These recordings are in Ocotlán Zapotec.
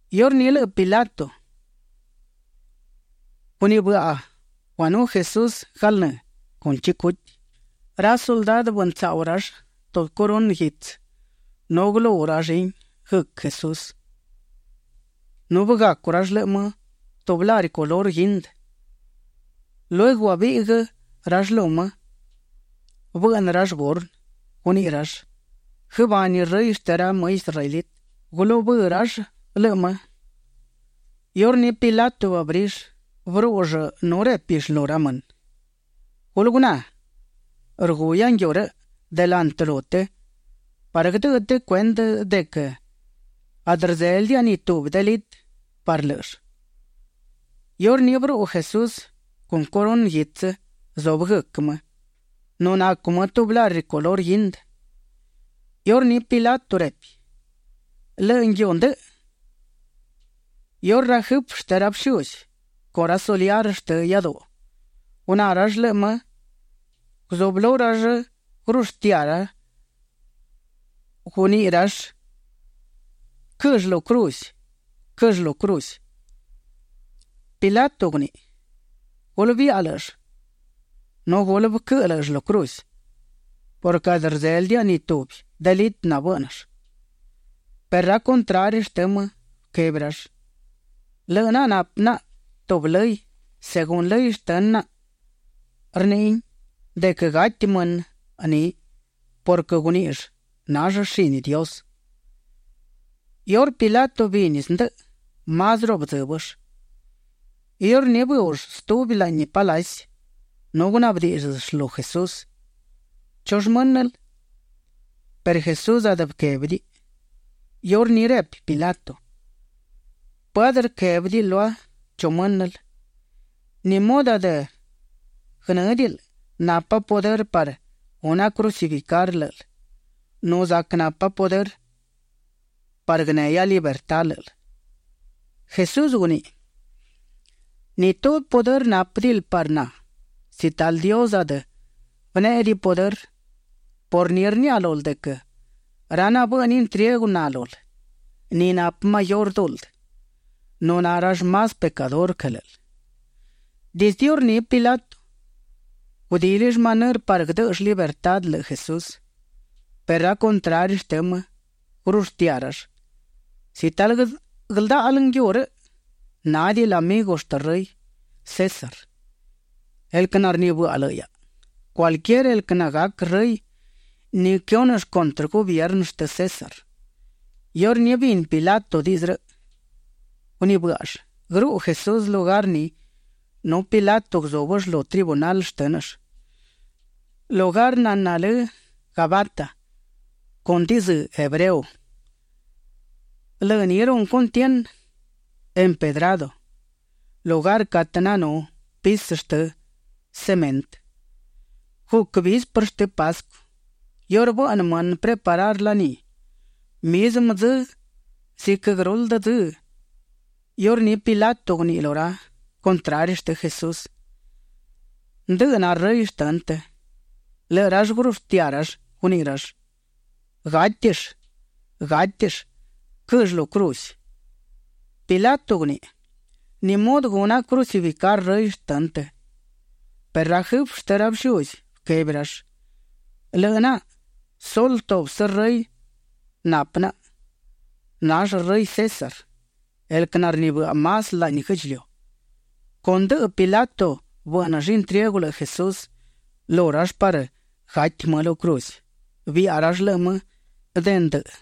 Iurní lëꞌë Pilato gunibëꞌa guanú Jesús galnë́ con chicuti. Ra suldadë bëntsaꞌu rall tubi corunë guitsë nu gulú rallin guëc Jesús nu bëgacu rall lëꞌë më tubi lari color guindë. Lueguë guabiꞌguë rall lu më; bëꞌnë rall burnë. Guniꞌi rall: ―Guëbani Rëy shtë ra më israelitë. Gulubë́ rall lëꞌë më. Iurní Pilato bëabrill; bërúꞌull nu répill lu ra mënë: ―Gulë guná, rguhia nguiu rëꞌ delantë lu të parë guëdëꞌë të cuendë de quë adë rdzélëdiaꞌa ni tubi delitë parë lë́ꞌëll. Iurní bëruꞌu Jesús con corunë guitsë zubë guëc më nu nacu më tubi lari color guindë. Iurní Pilato repi: ―Lëꞌë nguiu ndëꞌë. Iurë ra jëfë shtë ra bëshuzi con ra soliar shtë iáduꞌu, guná rall lëꞌë më, guzublú gurushtiá; guniꞌi rall: ―Quëll lu cruz. Quëll lu cruz. Pilato guniꞌi: ―Gulë biaꞌa lë́ꞌëll nu gulë bëquëꞌë lë́ꞌëll lu cruz purquë adë rdzélëdiaꞌa ni tubi delitë nabë́ꞌnëll. Perë ra contrari shtë më bëquebi rall: ―Lëꞌë naꞌa napë naꞌa tubi lëy; según lëy shtë naꞌa rniꞌin de quë gati mënë ni purquë guníꞌill nall shini Dios. Iurë Pilato bini zndëꞌë, másruꞌu bëdzë́bëll. Iurní bëuꞌll stubi laꞌni palaci nu gunaꞌbë díꞌdzëll lu Jesús: ―¿Chu më́nël? Perë Jesús adë bëquébidiꞌiꞌ. Iurní repi Pilato: ―¿Pë adë guëquébidiꞌil lua chu më́nël? ¿Ni mudë adë guënë́diꞌil napa pudërë parë guna crucificar lë́ꞌël nu zac napa pudërë parë guënehia libertá lë́ꞌël? Jesús guniꞌi: ―Ni tubi pudërë nápëdiꞌil parë na si talë Dios adë bënéꞌediꞌiꞌ pudërë. Por ni rniaꞌa lul de quë ra nabëꞌnë intriegu na lul, ni napë mayurë duldë. Na rall más pecadurë quë lë́ꞌël. Dizdë iurní Pilato gudílill manërë parë guëdë́ꞌëll libertá lëꞌë Jesús, perë ra contrari shtë më gurushtiá rall: ―Si talë guëldáꞌal nguiu rëꞌ, nádiꞌil amigu shtë rëy César, el quë narnibëꞌa lëꞌë hiaꞌa. Cualquier el quë nagac rëy, ni quëhúnëll cuntrë gubiernë shtë César. Iurë bini Pilato diꞌdzë rëꞌ, gunibë́ꞌall guëruꞌu Jesús lugar ni nu Pilato guzúbëll lu tribunal shtë́nëll, lugar naná lë Gabata con dizë́ hebreo. Lë ni runë cuntienë, Empedrado, lugar catë nanú pisë shtë cemëntë. Guc visperë shtë Pascu, iurë bëꞌnë mënë preparar laní. Mizmë dzë ziquë guëruldë dzë, iurní Pilato guniꞌi lu ra contrari shtë Jesús: ―Ndëꞌë na rëy shtënë të. Lëꞌë rall gurushtiá rall; guniꞌi rall: ―Gátill, gátill, quëll lu cruz. Pilato guniꞌi: ―¿Ni mudë guna crucificar rëy shtënë të? Perë ra jëfë shtë ra bëshuzi bëquebi rall: ―Lëꞌë naꞌa sulë tubsë rëy napë naꞌa. Nall rëy César, el quë narnibëꞌa más laꞌni guë́ꞌdchiliu. Con ndëꞌë Pilato bë́ꞌnëll intriegu lëꞌë Jesús lu rall parë gati më lu cruz. Biaꞌa rall lëꞌë më de ndë.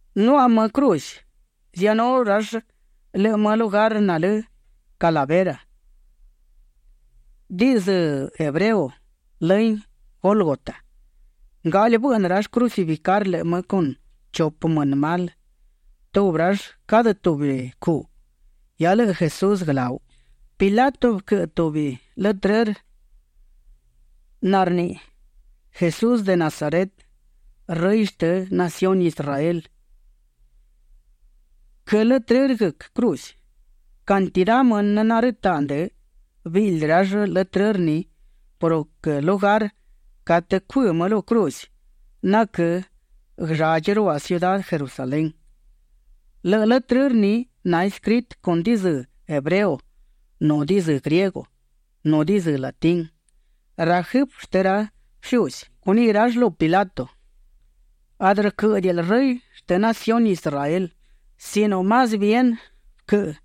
Nuaꞌa më cruz. Ziaꞌanú rall lëꞌë më lugar nalë Calavera, diꞌdzë hebreo lëhin Gólgota. Ngaꞌli bëꞌnë rall crucificar lëꞌë më con chupë mënë mal, tubi rall cadë tubi cuꞌ, hia lëꞌë Jesús guëláu. Pilato bëquëꞌë tubi letrërë narniꞌi: “Jesús de Nazaret, rëy shtë naciuni Israel”. Quë letrërë guëc cruz. Cantidá mënë narëtaꞌ ndë, biꞌldi rall letrërë ni purquë lugar catë cuë më lu cruz naquë́ guëlladchi ruaꞌ ciudá Jerusalén. Lëꞌë letrërë ni naescritë con dizë́ hebreo, nu dizë́ griego, nu dizë́ latín. Ra jëfë shtë ra bëshuzi guniꞌi rall lu Pilato: ―Adë rquë́ꞌëdiꞌil “Rëy shtë naciuni Israel” sino más bien bëquëꞌë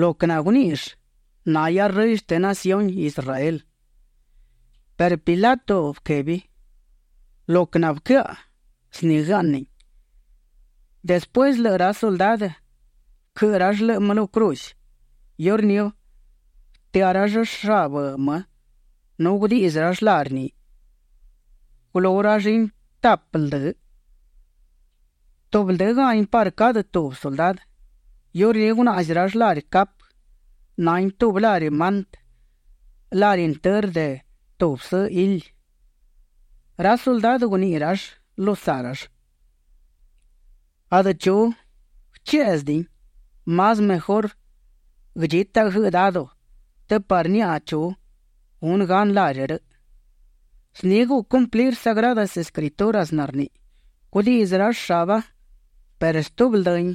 lo quë naguníꞌill: “Nahia Rëy shtë naciuni Israel”. Perë Pilato bëquebi: ―Lo quë nabëquëaꞌa, zni guëaꞌnin. Despuësë lëꞌë ra suldadë bëquëꞌë rall lëꞌë më lu cruz, iurní bëtëá rall shabë më nu gudiꞌdzë rall lari ni. Gulú rallin tapë ldë, tubi ldë́gahin parë cadë tubi suldadë. Iurní gunaꞌzi rall lari capë. Nahin tubi lari mantë, lari intërë de tubsë hili. Ra suldadë guniꞌi rall lu saꞌ rall: ―Adë chu guëchéꞌzëdiꞌin; más mejurë guëdchítaꞌa guëꞌë dado të parë niaꞌa chu gunë gan lari rëꞌ. Zni guc cumplir Sagradas Escrituras narniꞌi: “Gudiꞌdzë rall shaba, perë stubi ldëhin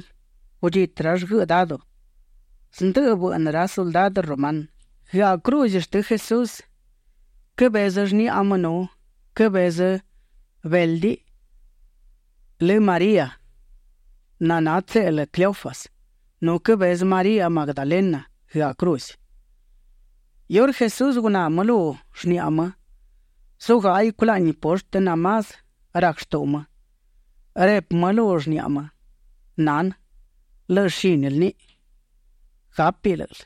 gudchitë rall guëꞌë dado”. Zndë bëꞌnë ra suldadë rumanë. Guëaꞌ cruz shtë Jesús quëbezë shniꞌa më nu quëbezë béldiꞌ lë María naná tseꞌlë Cleofas. Nu quëbezë María Magdalena guëaꞌ cruz. Iurë Jesús guná më lu shniꞌa më, zugáꞌaiꞌ culaꞌni poshtë namás rac shtuꞌu më, repi më lu shniꞌa më: ―Nanë, lëꞌë shínil niꞌi. Gápiꞌ lë́ꞌël.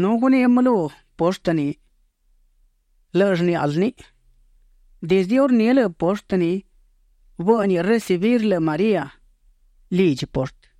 Nu guniꞌi më lu poshtë ni: ―Lëꞌë shníꞌal niꞌi. Dizdë iurní lëꞌë poshtë ni bë́ꞌniꞌ recibir lëꞌë María lidchi poshtë.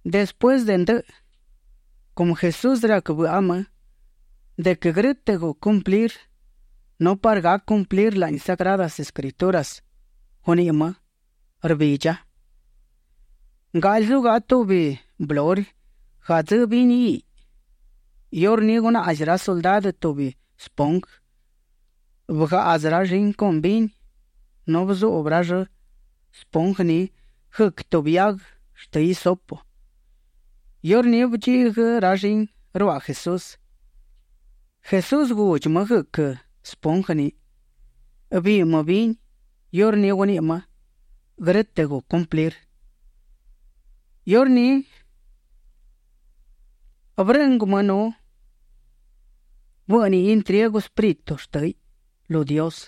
Despuësë de ndëꞌë, cumë Jesús rac bëꞌa më de quë grë́tëꞌ guc cumplir nu parë gac cumplir laꞌni Sagradas Escrituras, guniꞌi më: ―Rbidcha. Ngaꞌli zugaꞌa tubi mbluri gadzë́ vini hiꞌ. Iurní gunaꞌzi ra suldadë tubi spongë; bëgaꞌdzë rallin con vini nu bëzuꞌbë rall spongë ni guëc tubi hiaguë shtë hisopo. Iurní bëdchiꞌguë rallin ruaꞌ Jesús. Jesús gudchi më guëc spongë ni, Biiꞌ më vini; iurní guniꞌi më: ―Grë́tëꞌ guc cumplir. Iurní bërëꞌngu më nu bë́ꞌniꞌ intriegu espíritu shtë́hiꞌ lu Dios.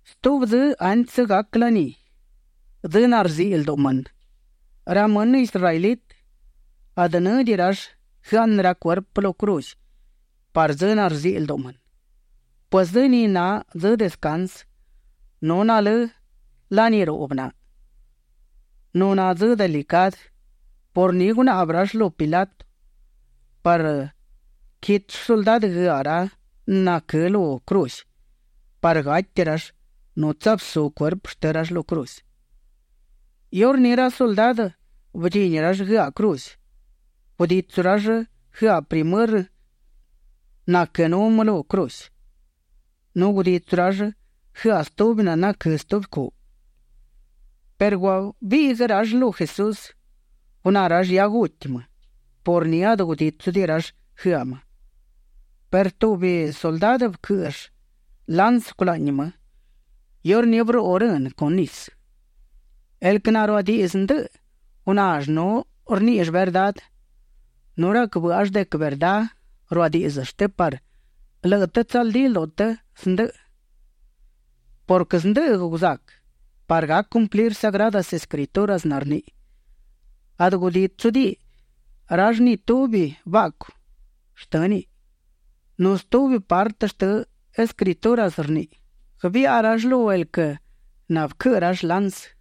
Stubi dzë antsë gac laní, dzë narziꞌi lduꞌu mënë, ra mënë israelitë adë në́diꞌi rall guëaꞌnë ra cuerpë lu cruz parë dzë narziꞌi lduꞌu mënë, pues dzë ni na dzë descansë nu nalë́ laní ruꞌbë na. Nu na dzë delicadë. Por ni gunaꞌbë rall lu Pilato parë quitsu suldadë guëaꞌ ra naquë́ lu cruz parë gati rall nu tsabsú cuerpë shtë rall lu cruz. Iurní ra suldadë bëdchini rall guëaꞌ cruz. Guditsu rall guëaꞌ primërë naquënú më lu cruz. Nu guditsu rall guëaꞌ stubi naquë́ stubi cuꞌ. Perë guabiꞌguë rall lu Jesús; guná rall hia guti më. Por ni adë gudítsudiꞌi rall guëaꞌ më. Perë tubi suldadë bëquë́ꞌëll lansë culaꞌni më. Iurní bëruꞌu rënë con nisë. El quë naruadiꞌdzë ndëꞌë gunall nu rníꞌill verdá nu rac bë́ꞌall de quë verdá ruadíꞌdzëll të parë lëꞌë të tsaldí lduꞌu të zndëꞌë purquë zndëꞌë guzac parë gac cumplir Sagradas Escrituras narniꞌi: “Adë gudítsudiꞌi rall ni tubi baꞌcu shtë́niꞌ”. Nu stubi partë shtë Escrituras rniꞌi: “Guëbiꞌa rall lu el quë nabëquëꞌë rall lansë”.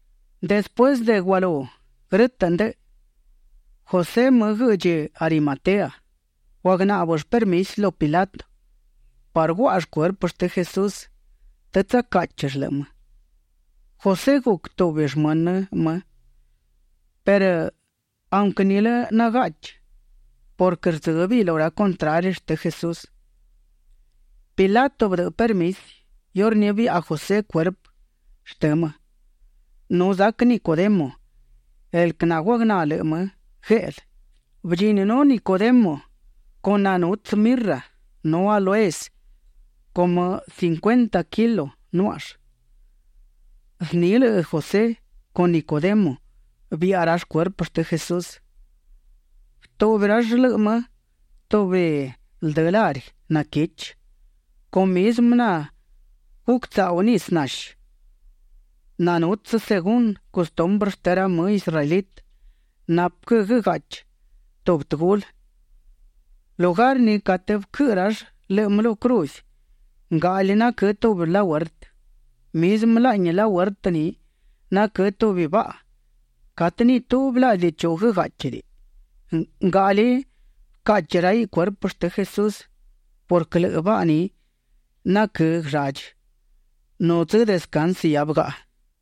Despuësë de gualú grë́tëꞌ ndëꞌë, José më guëꞌdchi Arimatea, guagnáꞌbëll permisi lu Pilato parë guáꞌall cuerpë shtë Jesús të tsacáꞌchill lëꞌë më. José guc tubi shmënë më perë aunquë nilë nagaꞌchi purquë rdzë́bëiꞌ lu ra contrari shtë Jesús. Pilato bëdëꞌë permisi; iurní biaꞌa José cuerpë shtënë më. Nu zac Nicodemo, el quë naguagná lëꞌë më gueꞌlë, bëdchininú Nicodemo con nanutsë mirra nu áloes cumë cincuenta kilo nuáꞌall. Zni lëꞌë José con Nicodemo biaꞌa rall cuerpë shtë Jesús. Bëtuꞌbi rall lëꞌë më tubi ldë lari naquichi con mizmë naguctsaꞌu nisë nashi nanutsë según custumbrë shtë ra më israelitë napë quë guëgaꞌchi tubi tëgulë. Lugar ni catë bëquëꞌë rall lëꞌë më lu cruz, ngaꞌli naquë́ tubi lahuertë. Mizmë laꞌni lahuertë ni naquë́ tubi baꞌa catë ni tubi laꞌdi chu bëgáꞌchidiꞌi. Ngaꞌli bëcaꞌchi raiꞌ cuerpë shtë Jesús purquë lëꞌë baꞌa ni naquë́ guëlladchi, nu dzë descansë hia bëgaꞌa.